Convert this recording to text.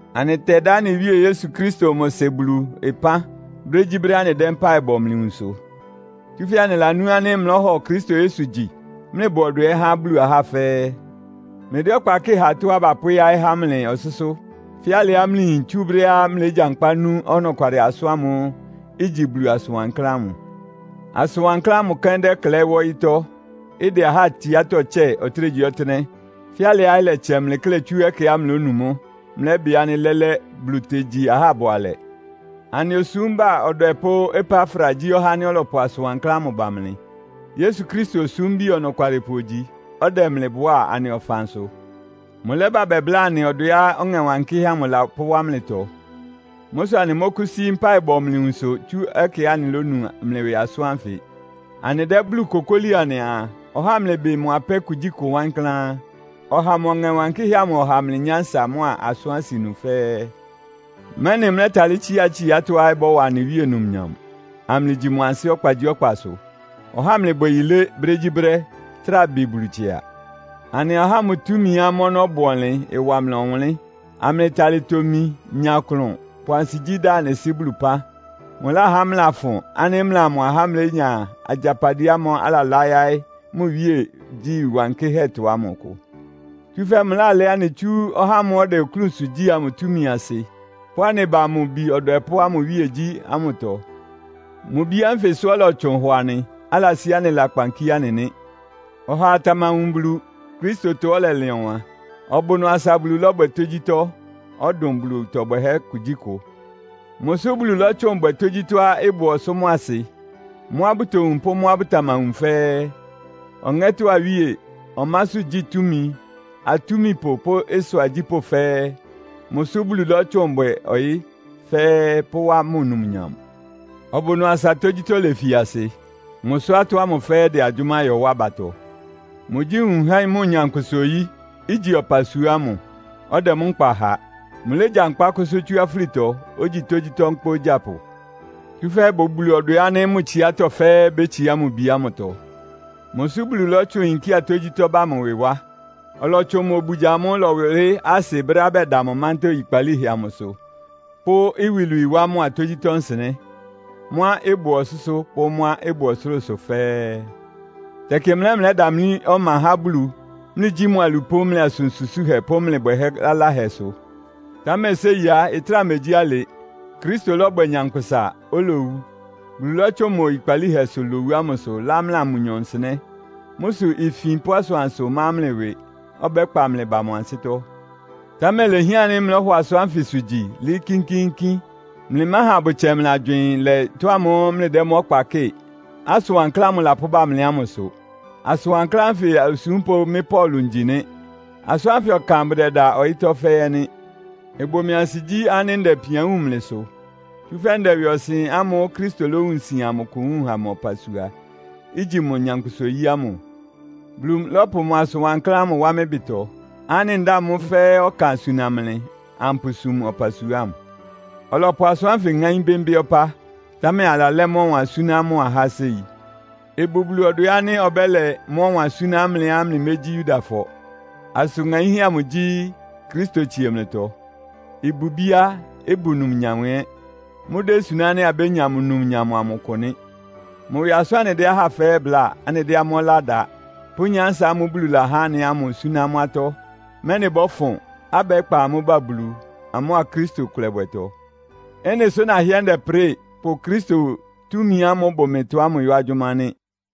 Anɩtɛdá anɩ Wíe Yesu Kristo mʋ Sɩ Bulu ɩpán brégyíbrɛ́á anɩdɛ́ mpáɩ bɔ mlɩ nwunsʋ. Tsúfɛ́ anɩlanú ánɩ́ mlɩlɔ́hɔ Kristo Yesu gyi, mlɩbʋ ɔdwɛ ɛ́ há Bulu ahá fɛ́ɛ́. Mlɩdɛ́ ɔkpa kɩ́ɩ ha tɔ́á bapʋ́yáɩ́ há mlɩ ɔsʋ́sʋ́; fɛ́ alɩá mlɩyin tsú brɛ́á mlɩlégyankpá nu ɔnɔkwalɩ asʋ́n ámʋ́ʋ́ igyi Bulu asʋn wankláán ámʋ. Asʋn wankláán ámʋ kɛ́n dɛ́klɛɩ́ wá ɔyɩ́tɔ́, ɩdɛ ahá tsiátɔ́ tsɛ́ɛ ɔtɩ́nɛgyíɔtɩ́nɛ́; fɛ́ alɩá ɩlɛtsɛ mlɩ tsú ɛkɛá mlɩlónu mʋ́, mlɩlɛ́bɩ ánɩ́ lɛ́lɛ́ Bulu tegyi ahá bʋalɛ. Anɩ osúmba ɔdwɛpʋ́ Epafra gyí ɔhá ánɩ́ ɔlɔpʋ asʋn wankláán ámʋ ba mlɩ. Yesu Kristo osúmbi ɔnɔkwalɩpʋ ogyi, ɔdɛ mlɩ bʋá anɩ ɔfansʋ. Mʋlɛ́bá bɛbláa anɩ ɔdwɛá Ɔŋɛ Wankɩ́hɛ́ amʋ lapʋ́wá mlɩtɔ. Mʋ́ sʋ anɩmɔ́kʋ́sí mpáɩ bɔ mlɩ nwunsʋ tsú ɛkɛá anɩlónu mlɩ ɩwɩ asʋ́n ánfɩ. Anɩdɛ́ Bulu kokóli anɩaa, ɔháa amlɩbɩ mʋ apɛ́ kugyíkʋ wankláán. Ɔháa mʋ Ɔŋɛ Wankɩ́hɛ́ amʋ ɔha mlɩ nyánsa mʋ́a asʋ́n asɩnu fɛ́ɛ́, mɛ́nɩ mlɛ́talɩ́ tsíá tsiátɔ́á ɩbɔ́wa anɩ Wíe numnyam, amlɩgyi mʋ ansɩ́ ɔkpagyíɔkpasʋ. Ɔháa amlɩbwɛ yilé brégyíbrɛ́, trá bɩ Bulu tsɩa. Anɩa ɔháa mʋ túmiá mʋ́ ɔnɔ́ bʋ ɔnlɩn ɩwa mlɩ ɔwʋnlɩ́n, amlɩtalɩ tomi, nya klʋn, pʋ ansigyí da anɩ Sɩ́ Bulu ɩpán. Mʋláhá mlɩlafʋn ánɩ́ mlɩa mʋ ahá mlénya agyapadɩɛ ámʋ́ʋ́ alalá yáɩ́ mʋ iwíegyí wankɩ́hɛ́tɔ ámʋ ɩkʋ. Tsúfɛ́ mʋlálɛ́ anɩ tsú ɔhá ámʋ́ʋ́ ɔdɛ oklúnsʋ gyí amʋ túmi asɩ, pʋ́ anɩ ba mʋ Bi ɔdwɛpʋ́ ámʋ iwíegyí amʋtɔ. Mʋ Bi ánfɩsʋ ɔlɔtsʋn hɔ anɩ, alasí anɩ lakpan kíé anɩ nɩ́. Ɔhaa tamawun Bulu, Kristotɔ ɔlɛlɩn ɔwan. Ɔbʋ ɩnʋ asa Bulu lɔ́bwɛ tógyítɔ́, ɔdʋn Bulu ɩtɔ bwɛhɛ́ kugyíkʋ. Mʋsʋ́ Bulu lɔ́tsʋn bwɛ tógyítɔ́á ɩbʋ ɔsʋ́ mʋ́a asɩ. Mʋ́á bʋtowun pʋ́ mʋ́á bʋtamawun fɛ́ɛ́, ɔŋɛ́tɔ́ awíe, ɔmásʋ́gyí túmi, atúmipʋ, pʋ́ ɩsʋ agyípʋ́ fɛ́ɛ́. Mʋsʋ́ Bulu lɔ́tsʋn bwɛ ɔyɩ́ fɛ́ɛ́, pʋ́wá mʋ numnyam. Ɔbʋ ɩnʋ asa tógyítɔ́ lefi asɩ. Mʋsʋ́ atɔ́ ámʋ fɛ́ɛ́ ɩdɛ agyʋ́má yɔ wá abatɔ. Mʋgyí nwun há mʋ nyankpʋsa-oyí, igyi ɔpasua ámʋ, ɔdɛ mʋ́ nkpa ha. Mʋlégyankpá kʋsʋ́ tsú afúlitɔ, ogyi tógyítɔ́ nkpá ogyápʋ. Tsúfɛ́ ɩbʋ Bulu ɔdwɛ ánɩ́ mʋ tsiátɔ́ fɛ́ɛ́ bétsiá mʋ Bi ámʋtɔ. Mʋsʋ́ Bulu lɔ́tsʋn yinkía tógyítɔ́ ba mʋ ɩwɩ wá. Ɔlɔtsʋn mʋ obugya amʋ́ʋ́ ɩlɔwʋlɩ́ asɩ brɛ́á bɛda mʋ mántá oyikpalíhɛ amʋsʋ pʋ́ iwilwii wá mʋa tógyítɔ́ nsɩnɛ́. Mʋ́a ɩbʋ ɔsʋ́sʋ́ pʋ́ mʋ́á ɩbʋ ɔsʋlʋ́sʋ fɛ́ɛ́. Tɛkɩ mlɩ ɛ́ mlɩlɛ́damlí ɔma há Bulu, mlɩgyí mʋ alupʋ́ mlɩ asʋ́n susúhɛ pʋ́ mlɩ bwɛhɛ́ laláhɛ sʋ. Támɛ séi á, ɩtráa megyí alɩ. Kristo lɔ́bwɛ nyankpʋsa, olowu. Bulu lɔ́tsʋn mʋ oyikpalíhɛsʋ lowu ámʋsʋ lá mlɩa mʋnyɔ nsɩnɛ́. Mʋ́ sʋ ifin pʋ́ asʋansʋ má mlɩ ɩwɩ, ɔbɛ́kpa mlɩ ba mʋ ansɩ́tɔ́. Támɛ ilehián ánɩ́ mlɔ́hɔ asʋ́nsʋ́ ánfɩ gyi, lɩ́ɩ́ kínkíínkín. Mlɩmáha abʋtsɛ mlɩ agywɩɩn lɛ ɩtɔ́ ámʋ́ʋ́ mlɩdɛ́ mʋ́ ɔkpa kɩ́ɩ, asʋn wankláán ámʋ lapʋ́ba mlɩ ámʋsʋ. Asʋn wankláán ánfɩ osúmpʋ́ mɩ́ Paulo ngyi nɩ́. Asʋ́n ánfɩ ɔkan bʋdɛda ɔyɩ́tɔ́ fɛ́ɛ́ ɛ́ nɩ́. Ɩbʋ mɩ ansigyí ánɩ́ ndɛ ipian wúun mlɩ sʋ. Tsúfɛ́ ndɛ ɩwɩɔsɩn ámʋ́ʋ́ Kristo lówun sian amʋ kʋ wúun ha mʋ ɔpasua, igyi mʋ nyankpʋsa-oyí ámʋ. Bulu lɔ́pʋ mʋ asʋ́n wankláán ámʋ wá mɩ́ ɩbɩtɔ, ánɩ́ ndáa mʋ́ fɛ́ɛ́ ɔkan suna mlɩ, ampʋsum ɔpasua ámʋ. Ɔlɔpʋ asʋ́n ánfɩ ŋáín bɩ́mbɩ́ ɔpá, támɛ alalɛ́ mʋ́ ɔwan súná mʋ ahá séi. Ɩbʋ Bulu ɔdwɛ ánɩ́ ɔbɛ́lɛ mʋ́ ɔwan súná mlɩá mlɩmégyí Yudafɔ. Asʋn ŋaínhɛ́ amʋ gyí, Kristo tsie mlɩtɔ. Ɩbʋ ibíá, ɩbʋ numnyam ɛ́. Mʋ́désuná ánɩ́ abénya mʋ numnyam amʋ ɩkʋ nɩ́. Mʋ ɩwɩ asʋ́n anɩdɛ́ ahá fɛ́ɛ́ bláa, anɩdɛ́ amʋ́ ɔlá da, pʋ́ nyánsa ámʋ́ʋ́ Bulu lahá anɩ ámʋ súná amʋ́ atɔ́; mɛ́nɩ bɔ́fʋn, abɛ́kpa amʋ́ ba Bulu, amʋ́a Kristo ɩkʋlɛbwɛtɔ́. Ɩ́nɩ sʋ nahɩ́ɛ́ ndɛprɩ́ɩ, pʋ Kristo túmi ámʋ́ʋ́ ɩbʋ mɩtɔ ámʋ yɔ́ agyʋ́má nɩ́.